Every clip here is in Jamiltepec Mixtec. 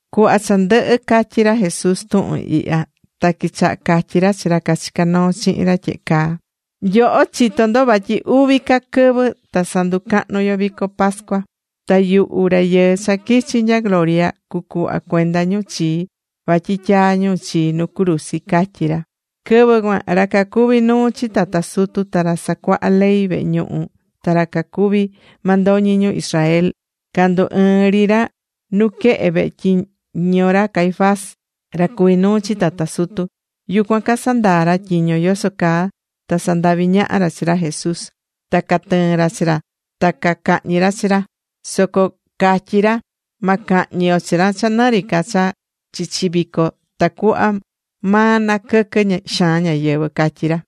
Cuhva cha ndɨhɨ̱ catyi̱ ra Jesús tuhun ihya, ta quichaha̱ catyi ra chi ra cachicá noo chihin ra tyehe caa: ―Nyoho chitó ndo vatyi uvi ca quɨvɨ ta sanducahnu yo vico pascua. Ta yuhu Rayɨɨ cha quichi̱ nya gloria cucuhva cuenda ñu chii vatyi tyaa ñu chii nu cruzi ―catyí ra. Quɨvɨ cuan ra cacuví nuu chi tata sutu, ta ra casacuahá ley vehe ñuhu, ta ra cacuví mandoñi ñu Israel, candu ɨɨ̱n ri ra nuquehe vehe tyiño ra Caifás, ra cuví nuu chi tata sutu. Yucuan casandaa̱ ra tyiño yoso caa ta sandavi ñaha ra chi ra Jesús ta catɨɨn ra chi ra ta cacahñi ra chi ra. Soco cacatyí ra: ―Ma cahñi yo chi ra cha nɨ ri ca cha chichi vico, tacuhva cha ma naquɨquɨ xaan ñáyɨvɨ ―catyí ra.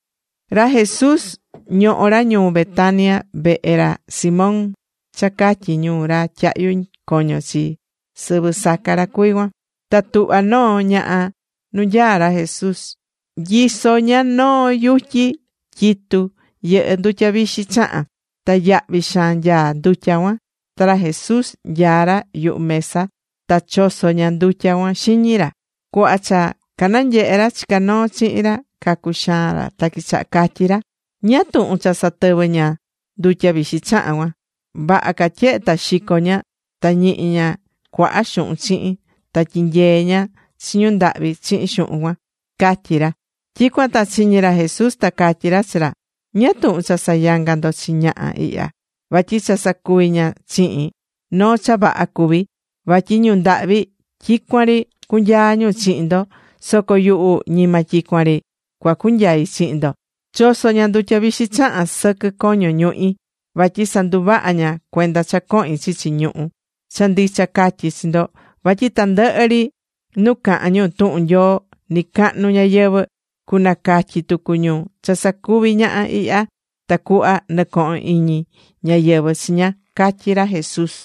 Ra Jesús ñohó ra ñuu Betania, vehe ra Simón, cha catyí ñu Ra Tyahyu Coño chi, sɨvɨ saca ra cuví cuan. Ta tuhva̱ noo ñaha nu nyaá ra Jesús, nyisó ña noo yutyi tyitú yɨhɨ́ ndutya vixi chahan. Ta yahvi xaan nyaá ndutya cuan. Ta ra Jesús nyaá ra yuhu mesa ta choso̱ ña ndutya cuan xiñi ra. Cuhva cha cananyehe̱ ra chicá noo chihin ra cacuxaa̱n ra ta quichaha̱ catyi ra: ―¿Ñáá tuhun cha satɨvɨ̱ ña ndutya vixi chahan cuan? Vaha ca tyehe ta xico̱ ña, ta ñihi ña cuaha xuhun chihin ta tyinyee ña chi ñu ndahvi chihin xuhun cuan ―catyí ra. Tyicuan ta chiñi̱ ra Jesús, ta catyí ra chi ra: ―¿Ñáá tuhun cha sayangá ndo chi ñaha ihya? Vatyi cha sacuvi̱ ña chihin, noo cha vaha cuví. Vatyi ñu ndahvi tyicuan ri cunyaa ñu chihin ndo, soco yuhu, ñima tyicuan ri cua cunyai chihin ndo. Choso̱ ña ndutya vixi chahan sɨquɨ coño ñuhi, vatyi sanduvaha̱ ña cuenda cha cohin chichi ñuhú. Cha ndicha catyí chi ndo, vatyi tandɨhɨ ri nu cahan ñu tuhun Nyoo nicahnu ñayɨvɨ̱, cunacatyi tucu ñu cha sacuvi̱ ñaha ihya, tacuhva nɨcohon iñi ñáyɨvɨ chi ña ―catyí ra Jesús.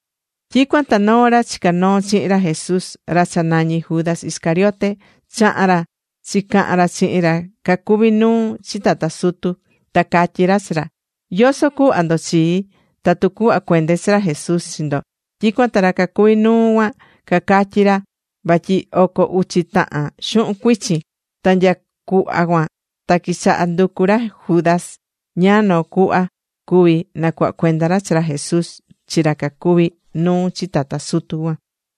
Tyicuan ta noo ra chicá noo chihin ra Jesús, ra cha nañí Judas Iscariote, chaha̱n ra chicahan ra chihin ra cacuví nuu chi tata sutu. Ta catyí ra chi ra: ―¿Yoso cuhva ndo chii tatu cuhva cuende chi ra Jesús chi ndo? Tyicuan ta ra cacuví nuu cuan cacatyi ra vatyi oco uchi tahan xuhun cuichin. Ta nya cuhva cuan ta quichaha̱ nducu ra Judas ñáá noo cuhva cuvi nacuhva cuenda ra chi ra Jesús chi ra cacuví nuu chi tata sutu cuan.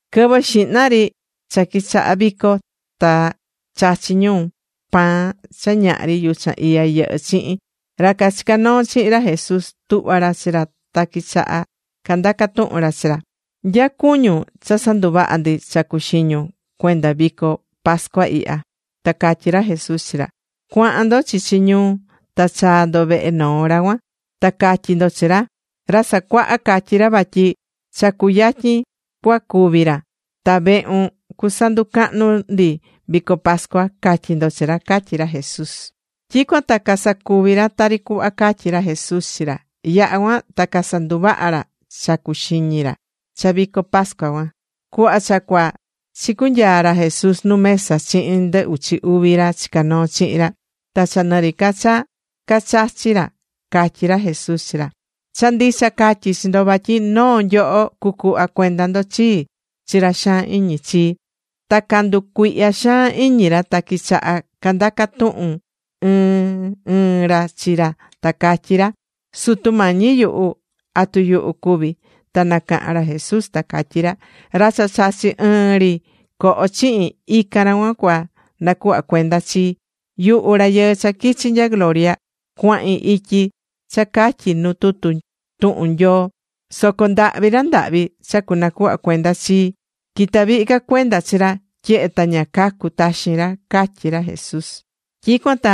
Quɨvɨ xihna ri cha quichaha̱ vico ta chachí ñu pan cha ñahri yuchan iya yɨhɨ́ chihin, ra cachicá noo chihin ra Jesús tuhva̱ ra chi ra ta quichaha̱ candaca tuhun ra chi ra: ―¿Nya cuñun cha sanduvaha ndi cha cuxiñun cuenda vico pascua ihya? Ta catyí ra Jesús chi ra: ―Cua̱han ndo chichi ñuu ta cha̱a ndo vehe noo ra cuan. Ta ca̱tyi ndo chi ra: “Ra Sacuaha catyí ra vatyi cha cuyatyin cua cúvi ra, ta vehun cusanducahnu ndi vico pascua”, ca̱tyi ndo chi ra ―catyí ra Jesús. Tyicuan ta casacuvi̱ ra tari cuhva catyi̱ ra Jesús chi ra. Yaha̱ cuan ta casanduvaha̱ ra cha cacuxiñi ra cha vico pascua cuan. Cuhva cha cuaa, chicunyaa̱ ra Jesús nu mesa chihin ndɨ uchi uvi ra chicá noo chihin ra. Ta cha nɨ ri ca cha cachachí ra, catyí ra Jesús chi ra: ―Cha ndicha catyí chi ndo vatyi noo nyoho cucuhva cuenda ndo chii chi ra xaan iñi chii. Ta canducuihya̱ xaan iñi ra, ta quichaha̱ candaca tuhun ɨɨn ɨɨn ra chi ra ta cacatyí ra: ―Sutu Mañi yuhu, ¿atu yuhu cuví? Ta nacaha̱n ra Jesús ta catyí ra: ―Ra cha chachí ɨɨn ri coho chihin, ican ra cuan cua na cuhva cuenda chii. Yuhu Rayɨɨ cha quichi̱ nya gloria, cuahin ityi cha catyí nu tutu tuhun Nyoo. Soco ndahvi ra ndahvi cha cunacuhva cuenda chii. Quitá vihi ca cuenda chi ra, tyehe ta ña cacu taxin ra ―catyí ra Jesús. Tyicuan ta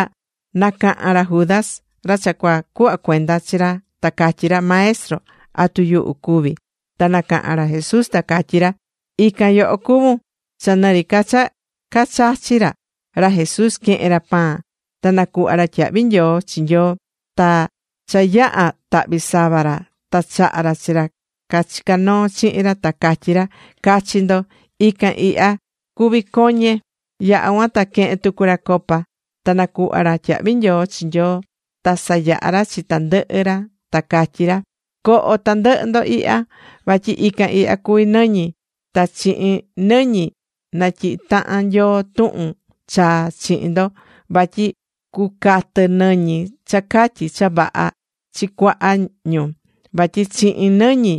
nacaha̱n ra Judas, ra cha cua cuhva cuenda chi ra, ta catyí ra: ―Maestro, ¿atu yuhu cuví? Ta nacaha̱n ra Jesús, ta catyí ra: ―Ican yoho cuvún. Cha nɨ ri ca cha cachachí ra, ra Jesús quehe̱n ra pan ta nacuhva̱ ra tyahvi nyoo chi Nyoo, ta cha yaha̱ tahvi sava ra, ta chaha̱ ra chi ra cachicá noo chihin ra, ta catyí ra: ―Ca̱chi ndo. Ican ihya cuví coñe. Yaha̱ cuan ta quehe̱n tucu ra copa, ta nacuhva̱ ra tyahvi nyoo chi Nyoo, ta sayaha̱ ra chi tandɨhɨ ra ta catyí ra: ―Co̱ho tandɨhɨ ndo ihya. Vatyi ican ihya cuví nɨñi. Ta chihin nɨñi natyihí tahan Nyoo tuhun chaa chihin ndo, vatyi cucatɨ nɨñi cha catyi cha vaha chi cuaha ñu, vatyi chihin nɨñi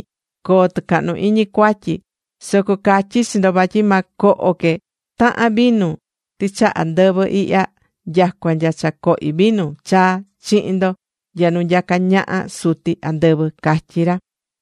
coo tɨcahnu iñi cuatyi ñu. Soco catyí chi ndo, vatyi ma coho que tahan vinu tɨchaha ndɨvɨ ihya, nyacua nya cha cohi vinu chaa chihin ndo nya nu nyacá ñaha Suti andɨvɨ ―catyí ra.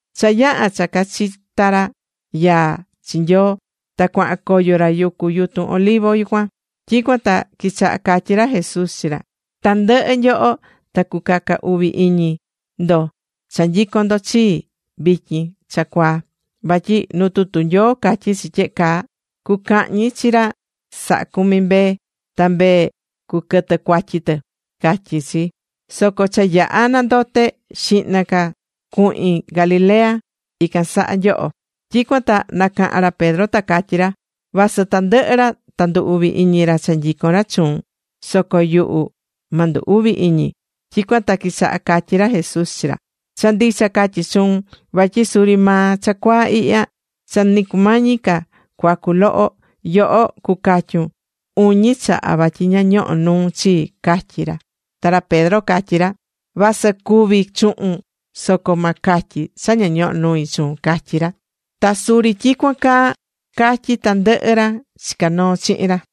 Cha yaha̱ cha cachita̱ ra yaa chi Nyoo, ta cuahan coyo ra yucu yutun Olivo cuan. Tyicuan ta quichaha̱ catyi ra Jesús chi ra: ―Tandɨhɨ nyoho ta cucaca uvi iñi ndo cha nyicón ndo chii vityin cha cuaa. Vatyi nu tutu Nyoo catyí chi tyehe caa: “Cucahñi chi ra sahá cumi mbee, ta mbee cuquɨtɨ cuatyi tɨ”, catyí chi. Soco cha yaha̱ nandote, xihna que cuhin Galilea, ican saha nyoho. Tyicuan ta nacaha̱n ra Pedro ta catyí ra: ―Vasɨ tandɨhɨ ra ndu uvi iñi ra cha nyicón ra chuun, soco yuhu ma ndu uvi iñi. Tyicuan ta quichaha̱ catyi ra Jesús chi ra: ―Cha ndicha catyí chuun vatyi suri maa cha cuaa ihya, cha ni cumañi ca cuacu loho, yoho cucatyun uñi chaha vatyi ña ñohó nuun chii ―catyí ra. Ta ra Pedro catyí ra: ―Vasɨ cúvi chuhun, soco ma catyi cha ña ñohó nui chuun ―catyí ra. Ta suri tyicuan caa catyí tandɨhɨ ra chicá noo chihin ra.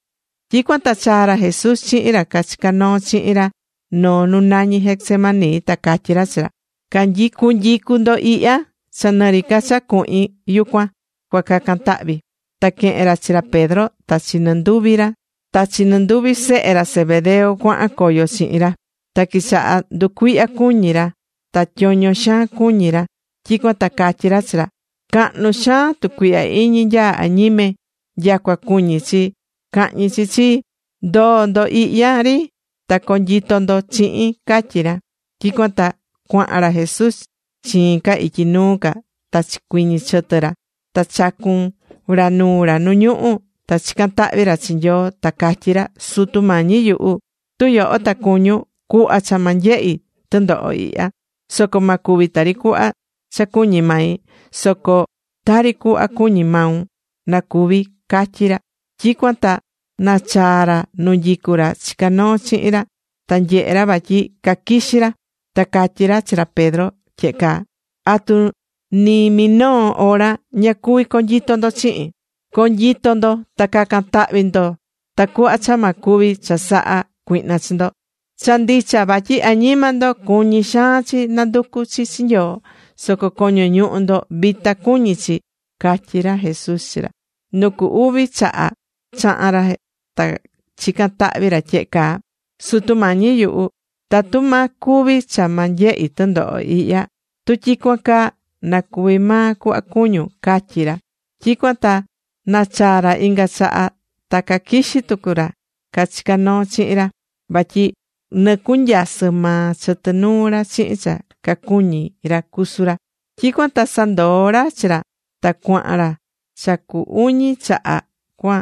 Tyicuan ta chaa̱ ra Jesús chihin ra cachicá noo chihin ra noo nu nañí Getsemaní, ta catyí ra chi ra: ―Cu̱nyicu ndo ihya, cha nɨri ca cha cuahin yucuan, cua cacan tahvi. Ta quehe̱n ra chi ra Pedro ta chi nɨ nduvi sehe ra Zebedeo, cuahan coyo chihin ra. Ta quichaha̱ nducuihya cuñi ra, ta tyoño xaan cuñi ra. Tyicuan ta catyí ra chi ra: ―Cahnu xaan tucuihya iñi nyaá añime. Nyacua cuñi chi cahñi chi chii. Ndo̱o ndo ihya ri ta co̱nyito ndo chihin ―catyí ra. Tyicuan ta cuahan ra Jesús chiin ca ityi nuu ca ta chicuiñi̱ chɨtɨ ra ta chacu̱n ra nuu ra nu ñuhú, ta chican tahvi ra chi Nyoo ta catyí ra: ―Sutu Mañi yuhu, tu yoho ta cuñun, cu̱hva cha ma nyehi tɨndoho ihya. Soco ma cuvi tari cuhva cha cuñí mai, soco tari cuhva cuñí maun na cuvi ―catyí ra. Tyicuan ta nachaa̱ ra nu nyicú ra cachica̱ noo chihin ra, ta nyehe̱ ra vatyi caquixí ra. Ta catyí ra chi ra Pedro tyehe caa: ―¿Atu ni minoo hora ña cuví conyito ndo chihin? Co̱nyito ndo, ta ca̱can tahvi ndo tacuhva cha ma cuvi chasaha cuihna chi ndo. Cha ndicha vatyi añima ndo, cuñí xaan chi nanducu chi Nyoo, soco coño ñuhu ndo vita cuñí chi ―catyí ra Jesús chi ra. Nu cu uvi chaha chaha̱n ra, ta chica̱n tahvi ra tyehe caa: ―Sutu Mañi yuhu, tatu ma cuvi cha ma nyehi tɨndoho ihya, tu tyicuan caa, na cuvi maa cuhva cuñún ―catyí ra. Tyicuan ta nachaa̱ ra inga chaha ta caquixí tucu ra cachicá noo chihin ra, vatyi nɨcunyasɨ maa chɨtɨ nuu ra chihin cha cacuñí ra cusu ra. Tyicuan ta sandoo̱ ra chi ra, ta cuahan ra cha cu uñi chaha cua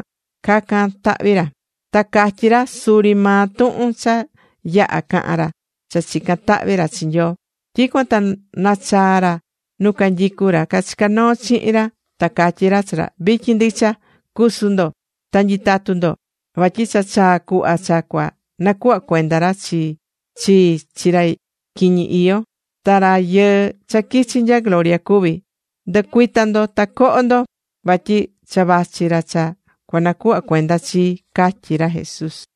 cacan tahvi ra. Ta catyí ra suri maa tuhun cha yaha̱ caha̱n ra cha chica̱n tahvi ra chi Nyoo. Tyicuan ta nachaa̱ ra nu canyicu ra cachicá noo chihin ra, ta catyí ra chi ra: ―Vityin ndicha, cu̱su ndo ta nyi̱tatu ndo. Vatyi cha chaa̱ cuhva cha cua nacuhva cuenda ra chii chi ra quiñi iyó, ta Rayɨɨ cha quichi̱ nya gloria cuví. Ndɨ̱cuita ndo, ta co̱ho ndo. Vatyi cha vachi ra cha cunacuhva cuenda chii ―catyí ra Jesús.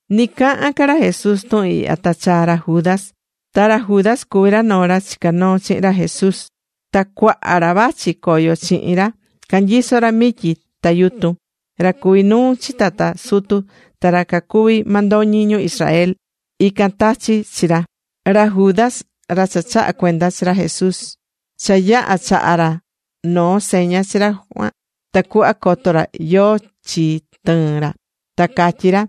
Ni cahán ca ra Jesús tuhun ihya, ta chaa̱ ra Judas, ta ra Judas cuví noo ra chicá noo chihin ra Jesús. Ta cuaha ra vachi coyo chihin ra, canyisó ra mityi ta yutun. Ra cuví nuu chi tata sutu, ta ra cacuví mandoñi ñu Israel, ican tachi̱ chi ra. Ra Judas, ra cha chahá cuenda chi ra Jesús, cha yaha̱ chaha̱ ra noo seña chi ra cuan, tacuhva coto ra yóó chi tɨɨn ra. Ta catyi̱ ra: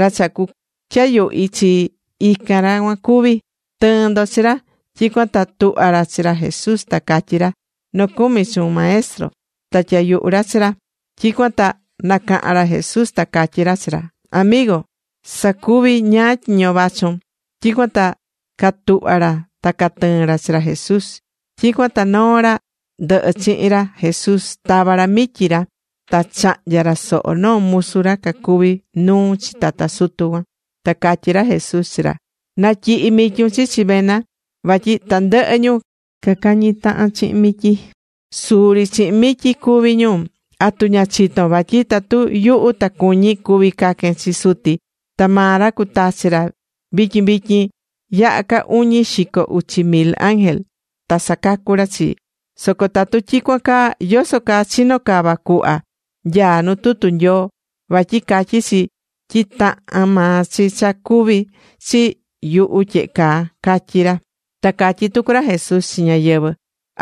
―Ra cha cutyayuhi chi, ican ra cuan cuví. Tɨ̱ɨn ndo chi ra. Tyicuan ta tuhva̱ ra chi ra Jesús ta catyí ra: ―Nocumi chuun, Maestro. Ta tyayuhu̱ ra chi ra. Tyicuan ta nacaha̱n ra Jesús ta catyí ra chi ra: ―Amigo, sa̱cuvi ñáá tyiño vachun. Tyicuan ta catuhva̱ ra ta catɨɨ̱n ra chi ra Jesús. Tyicuan ta noo ra ndɨhɨ chihin ra Jesús, tava̱ ra mityi ra ta chahnya̱ ra soho noo musu ra cuví nuu chi tata sutu cuan. Ta catyí ra Jesús chi ra: ―Na̱tyihi mityun chichi vena. Vatyi tandɨhɨ ñu cacañi tahan chihin mityi, suri chihin mityi cúvi ñu. ¿Atu ña chitón vatyi tatu yuhu ta cuñí, cuví caquen chi Suti, ta maa ra cutachi ra vityin vityin yaha ca uñi xico uchi mil ángel, ta sacacu ra chii? Soco tatu tyicuan caa, ¿yoso caa chino cava cuhva nyaá nu tutu Nyoo? Vatyi catyí chi tyi tahán maa chi cuvi chi yuhu tyehe caa ―catyí ra. Ta catyí tucu ra Jesús chi ñáyɨvɨ: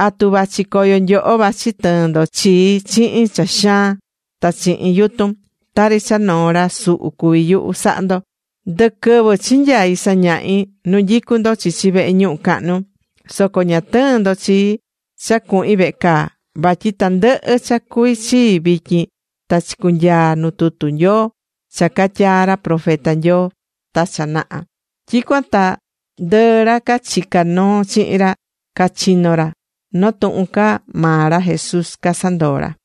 ―¿Atu vachi coyo nyoho vachi tɨɨn ndo chii chihin cha xaan ta chihin yutun? Tari cha noo ra suhu cuví yuhu sahá ndo. Ndɨquɨvɨ chinyai̱ sañahi nu nyicú ndo chichi vehe ñuhu cahnu, soco ña tɨɨ̱n ndo chii cha cuhin vehe caa. Vatyi tandɨhɨ cha cuví chii vityin, ta chicunyaa̱ nu tutu Nyoo, cha catyaa̱ ra profeta Nyoo ta cha naha. Tyicuan ta ndɨɨ ra cachicá noo chihin ra, cachino̱ ra. Noo tuhun ca maa ra Jesús casandoo̱ ra.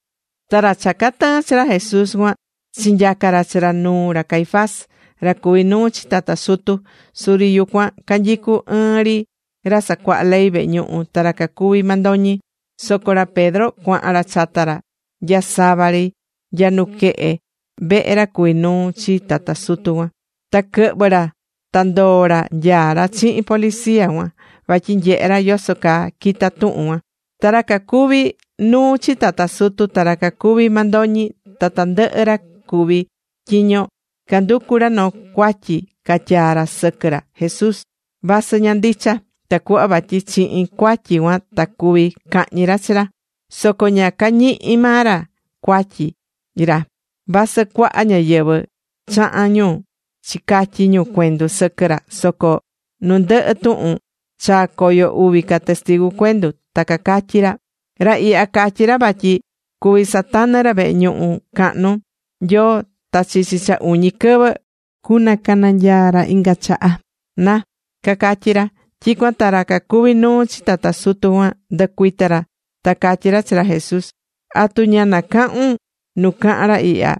Ta ra cha catɨɨ̱n chi ra Jesús cuan, chinyaca̱ ra chi ra nuu ra Caifás, ra cuví nuu chi tata sutu. Suri yucuan canyicú ɨɨn ri ra sacuaha ley vehe ñuhu ta ra cacuví mandoñi. Soco ra Pedro cuahan ra chata ra, nya sava ri nya nuquehe vehe ra cuví nuu chi tata sutu cuan. Ta quɨhvɨ̱ ra ta ndoo̱ ra nyaá ra chihin policía cuan, vatyi nyehe ra yoso caa quita tuhun cuan. Ra cacuví nuu chi tata sutu, ta ra cacuví mandoñi, ta tandɨhɨ ra cuví tyiño, canducu ra noo cuatyi catyaa ra sɨquɨ ra Jesús, vasɨ ña ndicha, tacuhva vatyi chihin cuatyi cuan ta cuví cahñi ra chi ra. Soco ña cañihi̱ maa ra cuatyi ra, vasɨ cuaha ñáyɨvɨ chaha̱n ñu chicatyi ñu cuendu sɨquɨ ra. Soco nu ndɨhɨ tuhun, chaa̱ coyo uvi ca testigu cuendu. Ta cacatyí ra: ―Ra ihya, catyi̱ ra vatyi cuví satanɨ ra vehe ñuhu cahnu Nyoo, ta chichi cha uñi quɨvɨ cunacananyaa ra inga chaha, na ―cacatyí ra. Tyicuan ta ra cuví nuu chi tata sutu cuan, ndɨcuita̱ ra, ta catyí ra chi ra Jesús: ―¿Atu ña nacahun nu cahan ra ihya?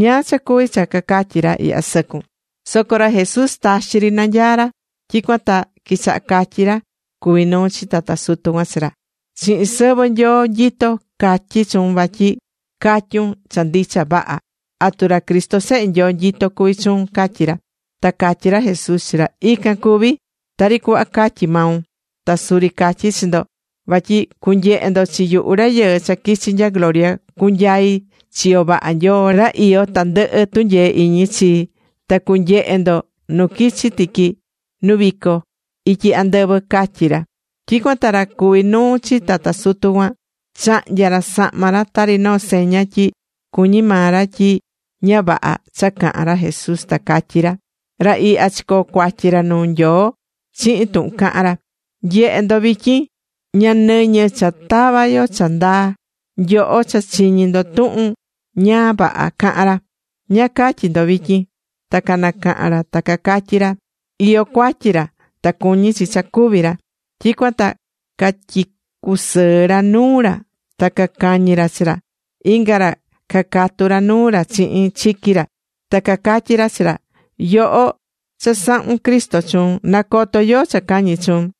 ¿Ñáá cha cuvi cha cacatyi ra ihya sɨcun? Soco ra Jesús taxi ri nanyaá ra. Tyicuan ta quichaha̱ catyi ra cuví nuu chi tata sutu cuan chi ra: ―Chihin sɨvɨ Nyoo nyitó, catyí chuun vatyi ca̱tyun cha ndicha vaha. ¿Atu ra Cristo Sehe Nyoo nyitó cuví chuun? ―catyí ra. Ta catyí ra Jesús chi ra: ―Ican cuví, tari cuhva catyí maun. Ta suri catyí chi ndo, vatyi cunyehe ndo chi yuhu Rayɨɨ cha quichi̱ nya gloria, cunyai chiyo vaha Nyoo ra iyó tandɨhɨ tunyee iñi chii, ta cunyehe ndo nu quichi tiqui nu vico ityi andɨvɨ ―catyí ra. Tyicuan ta ra cuví nuu chi tata sutu cuan chahnya̱ ra sahma ra tari noo seña tyi cuñí maa ra tyi ña vaha cha caha̱n ra Jesús, ta catyí ra: ―Ra ihya chicoo̱ cuatyi ra nuu Nyoo chihin tuhun cahán ra. ¡Nye̱he ndo vityin! Ña nɨñɨ cha tava yo cha ndaa. Nyoho cha chiñi̱ ndo tuhun ña vaha caha̱n ra. ¿Ñáá catyí ndo vityin? Ta canacaha̱n ra ta cacatyí ra: ―Iyó cuatyi ra, ta cuñí chi cha cúvi ra. Tyicuan ta catyicusɨɨ̱ ra nuu ra ta cacañi̱ ra chi ra. Inga ra cacatu ra nuu ra chihin chiqui ra. Ta cacatyí ra chi ra: ―Yoho, cha sahún Cristo chuun. ¡Na̱coto yóó cha cañi̱ chuun!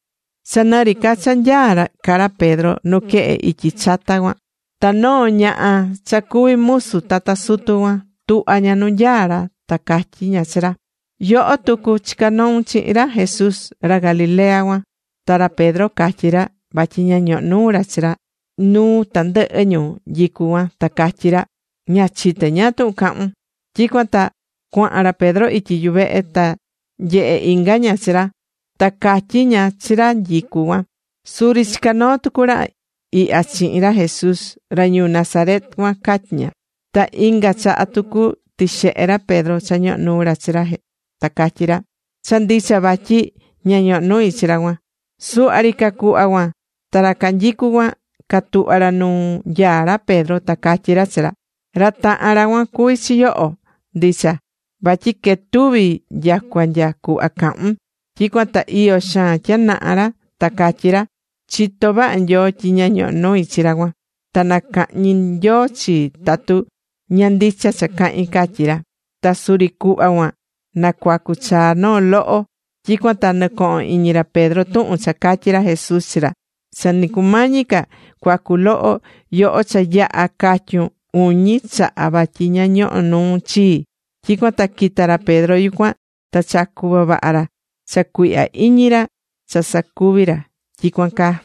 Cha nɨri ca cha nyaá ca ra Pedro nuquehe ityi chata cuan, ta noo ñaha cha cuví musu tata sutu cuan, tuhva̱ ña nu nyaá ra ta catyí ña chi ra: ―Yoho tucu chica̱ noun chihin ra Jesús, ra Galilea cuan. Ta ra Pedro catyí ra vatyi ña ñohó nuu ra chi ra nuu tandɨhɨ ñu nyicú cuan, ta catyí ra: ―Ña chité ñáá tuhun cahún. Tyicuan ta cuahan ra Pedro ityi yuvehe, ta nyehe̱ inga ña chi ra, ta catyí ña chi ra nyicú cuan: ―Suri chica̱ noo tucu ra ihya chihin ra Jesús, ra ñuu Nazaret cuan ―catyí ña. Ta inga chaha tucu tixehe̱ ra Pedro cha ñohó nuu ra chi ra ta catyí ra: ―Cha ndicha vaha tyi ña ñohó nui chi ra cuan. Suhva ri ca cuhva cuan, ta ra canyicú cuan catuhva̱ ra nu nyaá ra Pedro ta cacatyí ra chi ra: ―Ra tahan ra cuan cuví chi yoho, ndicha. Vatyi quetuvi nyacua nya cuhva cahún. Tyicuan ta iyo xaan tyanaha ra ta catyí ra: ―Chitó vaha Nyoo tyi ña ñohó nui chi ra cuan, ta nacahñi Nyoo chii tatu ña ndicha cha cahín ―catyí ra. Ta suri cuhva cuan nacuacu chaa noo loho. Tyicuan ta nɨcoho̱n iñi ra Pedro tuhun cha catyi̱ ra Jesús chi ra: “Cha ni cumañi ca cuacu loho, yoho cha yaha catyun uñi chaha vatyi ña ñohó nuun chii.” Tyicuan ta quita̱ ra Pedro yucuan, ta chacu̱ vavaha ra cha cuihya iñi ra cha sacuvi̱ ra tyicuan caa.